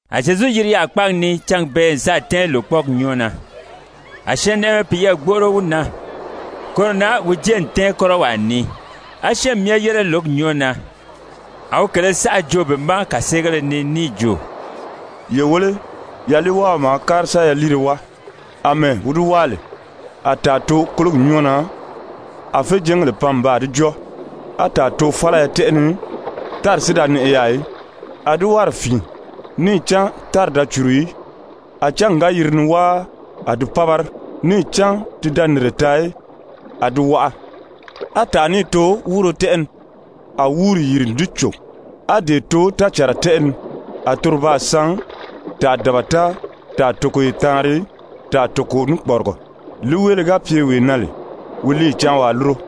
A Zyezu yiri yaà kpáagi ni cángi bee n sáà tɛ́ɛn lòkpɔɔgi nyɔ́ɔ na. A syɛɛnnɛʔɛmɛ piyɛɛ gbóʔoro wi na, koro na wi jée n tɛ́ɛn kɔ́rɔwaa ni. A syɛ́ɛnmi myɛ yére lǒgi nyɔ́ɔ na. A wi kèlē saʔa joo be ma kàseegéle ni níì jo: «Ye wéle, yaliiwáaɔ maa kári sa yaliire wáa. Amɛɛ wi di wáa lè, a tàa too kólogi nyɔ́ɔ na, a féjɛɛngèle pan n baa di jɔ́ɔ. A tàa too fálaya tɛ́ʔɛ ni, tári si da nɛʔɛ yaà í, a di wárì fìin, níì cán tári da cùru í. A cángi ga yiri ni wáa, a di pábari, níì cán ti da nìnre taa í, a di waʔa. A tàa níì too wúuro tɛ́ʔɛ ni, a wúuri yìri n di cò. A dee too tácànra tɛ́ʔɛ ni, a toro baa san, tàa dabata, tàa togoye taanri, tàa toko ní kpɔrigɔ. Líiweele ga pye wee na lè, wi líiyi cáan waa lúro.»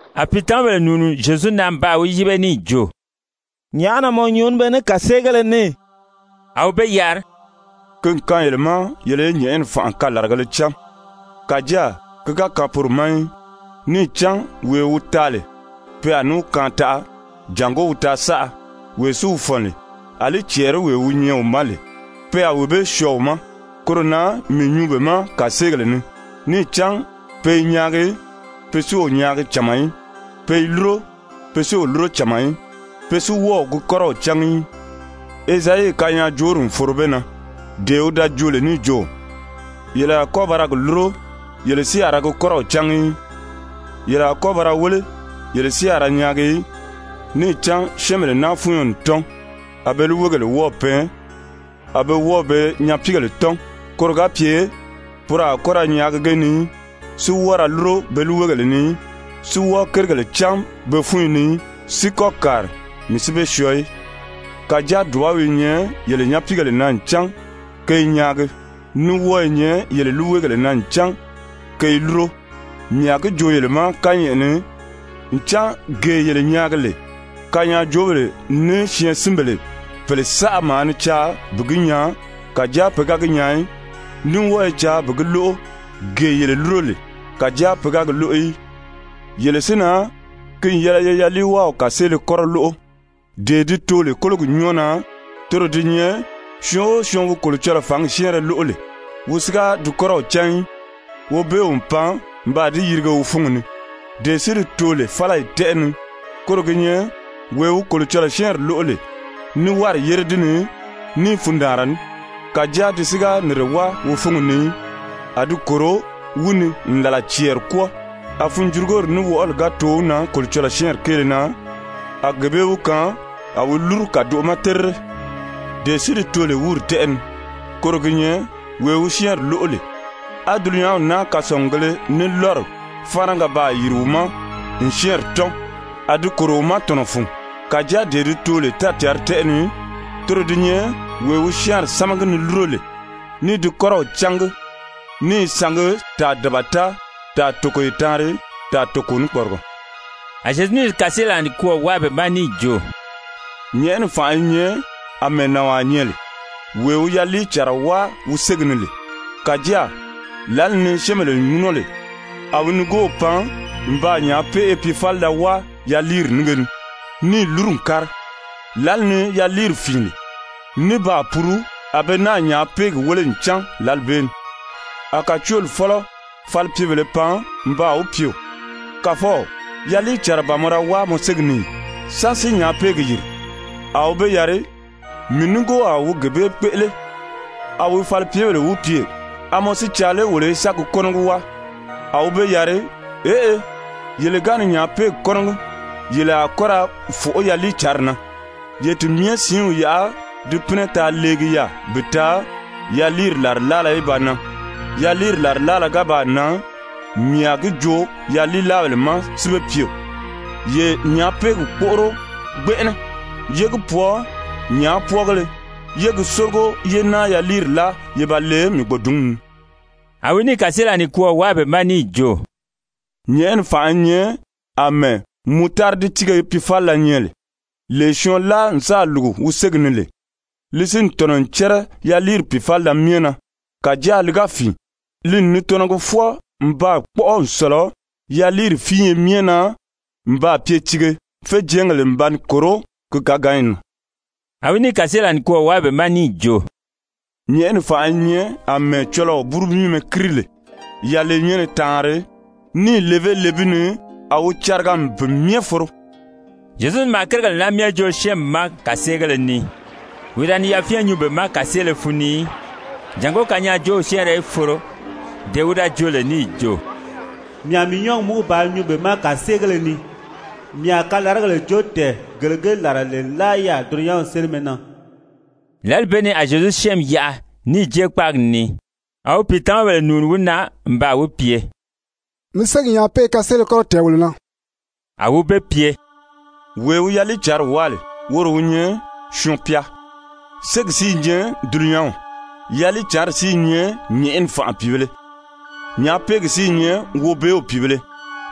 A pìitamabèle nùuni Zyezu na n baa wi yíbe níì jo: «Nyàʔá na mɔ nyuu ní be ní kàseegéle ni?» A wi be yari: «Ki n kaan yele ma yele í nyɛ̀ʔɛni fànʔa kalaragēle cán, kàjáa ki ga kaan poro ma í. Níì cán wee wi taa lè, pe a ní wi kaan taʔa, jàngó wi taa saʔa. Wee si wi fɔ̀n lè, àlí cɛɛriwee wi nyɛ wi ma lè, pe a wee bee syɔɔ wi ma. Koro na mii nyuu be ma kàseegèle ni, níì cán pe i nyaagi pe si o nyaagi cama í, pe i lúro pe si o lúro cama í, pe si wɔ́ɔ o gi kɔ́rɔw cángi í. Ezayi kanyaajoori n foro be na, dee wi da joo lè níì jo: ‹Yele a kɔ́ ba ra gi lúro, yele si a ra gi kɔ́rɔw cángi í. Yele a kɔ́ ba ra wéle, yele si a ra nyaagi í. Níì cán syɛ́ɛnbèle naa fúnyo n tɔ́n, a be líiweegèle wɔ́ɔ̀ pɛɛn. A be wɔ́ɔ̀ be nyapiigèle tɔ́n, koro ga pye poro a kɔ́ ra nyaagi ge ni í, si wɔ́ɔ ra lúro be líiweegèle ni í, si wɔ́ɔ kérigèle cán be fúnyi ni í, si kɔ́ kàri, mii si be syɔɔ í.› Kàjáa dùbaw i nyɛ yele nyapiigèle na ncan ke i nyaagi, ní wɔ́ɔ i nyɛ yele líiweegèle na ncan ke i lúro. Mii a gi joo yele ma kányɛʔɛ ni, ncan gee yele nyaagi lè, kanyaajoobèle ní syɛɛnsinbèle pèle saʔa maa ni caa bi gi nyaa, kàjáa pe ga gi nyaa í, ní wɔ́ɔ i caa bi gi lóʔo, gee yele lúro lè, kàjáa pe ga gi lóʔo í. «Yele si na, ki n yɛlɛ ye yaliiwáaw kàseele kɔ́rɔ lóʔo. Dee di too lè kólogi nyɔ́ɔ na, toro di nyɛ syɔɔn o syɔɔn wi Kolocɔlɔɔ fǎngi syɛ́ɛnrɛ lóʔo lè, wi si ga di kɔ́rɔw cán í, Wobeew n pan n baa di yirige wi fúngi ni. Dee si di too lè fálayi tɛ́ʔɛ ni, koro gi nyɛ wee wi Kolocɔlɔɔ syɛ́ɛnri lóʔo lè ní wárì yére di ni ní fundaanra ní. Kàjáa di si ga nìnre wáa wi fúngi ni í, a di kòro wi ni n làla cɛɛri kwɔ́ɔ, a funjurugori ní wɔʔɔli ga too wi na Kolocɔlɔɔ syɛ́ɛnri kéele na, a gee bee wi kaan a wi lúru kàdoʔo ma terire. Dee si di too lè wúuri tɛ́ʔɛ ni, koro gi nyɛ wee wi syɛ́ɛnri lóʔo lè, á dulunyanw naa kasɔngugēle ní lɔ́ri fáanaga baa yìri wi ma n syɛ́ɛnri tɔ́n, a di kòro wi ma tɔ̀nɔ fun. Kàjáa dee di too lè tácǎnri tɛ́ʔɛ ni, toro di nyɛ wee wi syɛ́ɛnri sámagi ni lúro lè, ní i di kɔ́rɔw cángi, ní i sangi, tàa dabata, tàa togoye taanri, tàa toko ní kpɔrigɔ.» A Zyezu níì kàseelaa nikwɔɔ wáa be ma níì jo: «Nyɛ̀ʔɛni fànʔa i nyɛ àmɛɛ nànwaa nyɛ lè, wee wi yaliicànra wáa wi ségi ni lè. Kàjáa lǎli ni syɛ́ɛnbèle ŋúnɔ lè, a wi nigoow pan n baa nyàápeʔe piifalida wáa yaliiri nínge ni níì lúru n kári. Lǎli ni yaliiri fìin lè ní baa puru, a be náà nyàápeegi wéle n cán lǎli bee ni. A kàcooli fɔ́lɔ falipyebèlē pan n baa wi pye: ‹Kàfɔw, yaliicànra ban mɔ da wáa mɔ ségi ni ì? Sán si nyàápeegi yìri?› A wi be yari: ‹Mii nigoowaa wi gee bee kpéʔele.› A wi falipyebèle wi pye: ‹A mɔ si i caa lé wolo í sa gi kɔ́nɔgi wáa?› A wi be yari: ‹Eʔe, yele ga ni nyàápeegi kɔ́nɔgi, yele a kɔ́ ra fòʔó yaliicǎnri na. Ye ti myɛ siinw yaʔa di pínɛ taa leegi yaà bi taa yaliiri làrilaala í ba nan. Yaliiri làrilaala ga baa nan, mii a gi joo yaliilaabèle ma si be pye: Ye nyàápeegi kpóʔoro gbɛnʔɛnɛ, yé gi pwɔɔ nyàápwɔɔgéle, yé gi sórigo, yé náa yaliiri láa ye ba le mii gbòdunni ni.›» A wi níì kàseelaa nikwɔɔ wáa be ma níì jo: «Nyɛ̀ʔɛni fànʔa i nyɛ àmɛɛ mutaridi tíige piifalila nyɛ lè, lee syɔɔn láa n sáà lùgu wi ségi ni lè. Li si n tɔ̀nɔ n cɛ́rɛ yaliiri pìifalida myɛ na. Kàjáa li ga fìin, li n ni tɔnɔgi fwɔɔ n baa kpɔ́ʔɔ n sɔ̀lɔ yaliiri fíinye myɛ na n baa pye tiige, féjɛɛngèle n ba ni kòró ki káganyi na.» A wi níì kàseelaa nikwɔɔ wáa be ma níì jo: «Nyɛ̀ʔɛni fànʔa i nyɛ àmɛɛ cɔlɔɔ búru míimɛ kíri lè yalenyɛnnɛ taanri, níì levé le bi ni, a wi cariga n pi myɛ foro.» Zyezu maa kérigèle naa myɛ joo syɛ́ɛnmi ma kàseegéle ni. Wi da ni yafyɛn nyuu be ma kàseele fun ni í, jàngó kanyaajoow syɛ́ɛnrɛ í foro, dee wi da joo lè níì jo: «Mii a mii nyɔ́ɔgi múgu bàā nyuu be ma kàseegéle ni. Mii a kalaragèle joo tɛ̀ɛn gele ge làra lè nlaa yaà dulunyanw sélimɛ na.» Lǎli bee ni a Zyezu syɛ́ɛnmi yaʔa níì jée kpáagi ni. A wi pìitamabèle nùuni wi na n baa wi pye: «Mi ségi nyàápeʔe kaseele kɔ́rɔ tɛ̀ɛn wolo na.» A wi be pye: «Wee wi yaliicǎnri wáa lè, woro wi nyɛ Syɔɔn-pya. Ségi si i nyɛ dulunyanw, yaliicǎnri si i nyɛ nyɛ̀ʔɛni fànʔa pìibēle. Nyàápeegi si i nyɛ Wobeew pìibēle.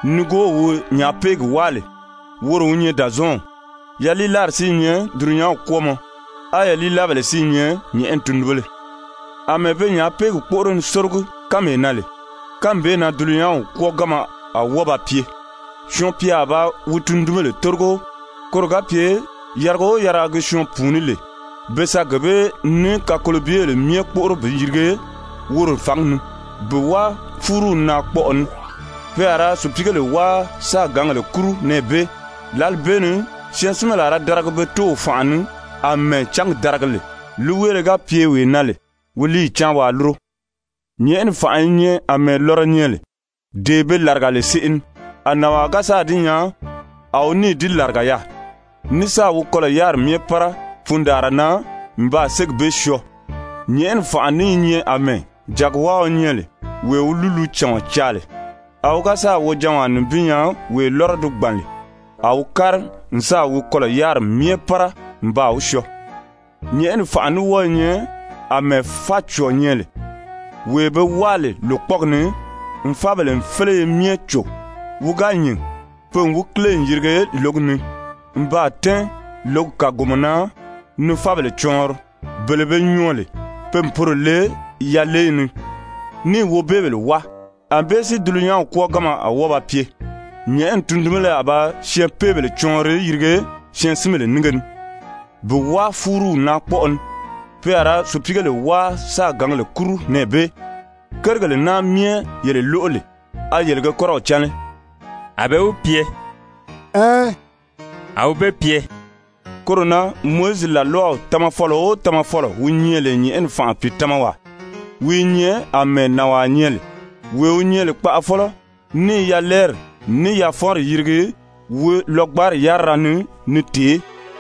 Nigoow wi nyàápeegi wáa lè, woro wi nyɛ Dàzɔɔnw. Yaliilaari si i nyɛ dulunyanw kwɔ́ɔmɔ. A yaliilaabèle si i nyɛ nyɛ̀ʔɛni tundunbéle. Amɛɛ pe nyàápeegi kpóʔoro ni sórogi kánmee na lè, kánmi bee na dulunyanw kwɔ́ɔganma a wɔ́ɔ ba pye. Syɔɔn-pya a ba wi tundunbèle tórigo koro ga pye yariga o yariga gi syɔɔn pùuní lè be sa gee bee ní kakolobyebèle myɛ kpóʔoro bi yirige woro fǎngi ni, bi wáa fúruw naakpɔʔɔ ni. Pe a ra sùpiigèle wáa sáā gǎngèle kúru nɛɛ bee. Lǎli bee ni syɛɛnsinbèle a ra daragi pe Tóow fànʔa ni àmɛɛ cángi daragi lè. Líiweele ga pye wee na lè, wi líiyi cáan waa lúro. «Nyɛ̀ʔɛni fànʔa i nyɛ àmɛɛ lɔrɔ nyɛ lè, dee be làriga lè seʔe ni. A nànwaa ga sáà di nyaa, a wi níì di làriga yaà, ní sáà wi kɔlɔ̀ yáriri myɛ pára fundaanra na n baa ségi bee syɔɔ. «Nyɛ̀ʔɛni fànʔa ní i nyɛ àmɛɛ jàgiwáaɔ nyɛ lè wee wi lúlucàɔn caa lè. A wi ga sáà wojanwaa nibin nyaa wee lɔ́rɔ di gbàn lè, a wi kári n sáà wi kɔlɔ̀ yáriri myɛ pára n baa wi syɔɔ. «Nyɛ̀ʔɛni fànʔa ní wɔ́ɔ i nyɛ àmɛɛ fácɔ̀ɔ nyɛ lè, wee be wáa lè lòkpɔɔgi ni n fábèle féleye myɛ cò. Wi ga nyìn, pe n wi kíle n yirige lǒgi ni n baa tɛ́ɛn lǒgi kàgomɔ na ni fábèle cɔɔnri. Bele be nyɔɔ lè, pe n poro le yaleyi ni níì wobeebèle wáa. Anbée si dulunyanw kwɔ́ɔganma a wɔ́ɔ ba pye. Nyɛ̀ʔɛni tundunbéle a ba syɛɛnpeebèle cɔɔnri yirige syɛɛnsinbèle nínge ni bi wáa fúruw naakpɔʔɔ ni. Pe a ra sùpiigèle wáa sáā gǎngèle kúru nɛɛ bee. «Kérigèle naa myɛ yele lóʔo lè, a yele ge kɔ́rɔw cán lé?» A be wi pye: «Ɛɛn.» A wi be pye: «Koro na Mowizi làlwaw tamafɔlɔ o tamafɔlɔ wi nyɛ lè nyɛ̀ʔɛni fànʔa pìitamawaa, wi i nyɛ àmɛɛ nànwaa nyɛ lè, wee wi nyɛ lè kpaʔafɔlɔ ní i yalɛɛri ní yafɔnri yirigi wi lɔgbanri yárira ni ni tèé.»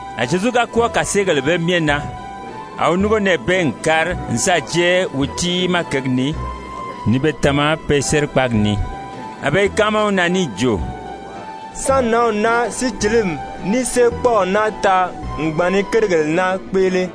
A Zyezu ga kwɔ́ɔ kàseegèle bee myɛ na, a wi núngo nɛɛ bee n kári n sáà jée wi tiimaa kěgi ni ni be tama pe sérikpaagi ni. A be i káama wi na níì jo: «Sán nǎnw naa sícilimi ní séekpɔɔw naa taa n gbàn ni kérigèle naa kpéʔele?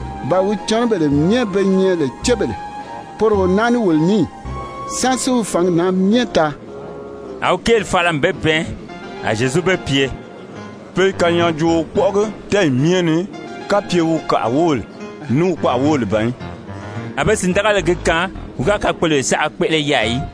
Ba wi cɔnɔbèle myɛ be nyɛ lè cébèle, poro o naa ní wolo ní ì? Sán si wi fǎngi naa myɛ taa?» A wi kéeli fala n be bɛɛn. A Zyezu be pye: «Pe i kanyaajooo kpɔ́ʔɔgi tɛ́ɛyi myɛ ni, kapye wi kàʔa wóbèle ní wi kpaʔa wóbèle ban í.» A be sìndagali gi kaan wi ga kakpoloyo saʔa kpéʔele yaà í.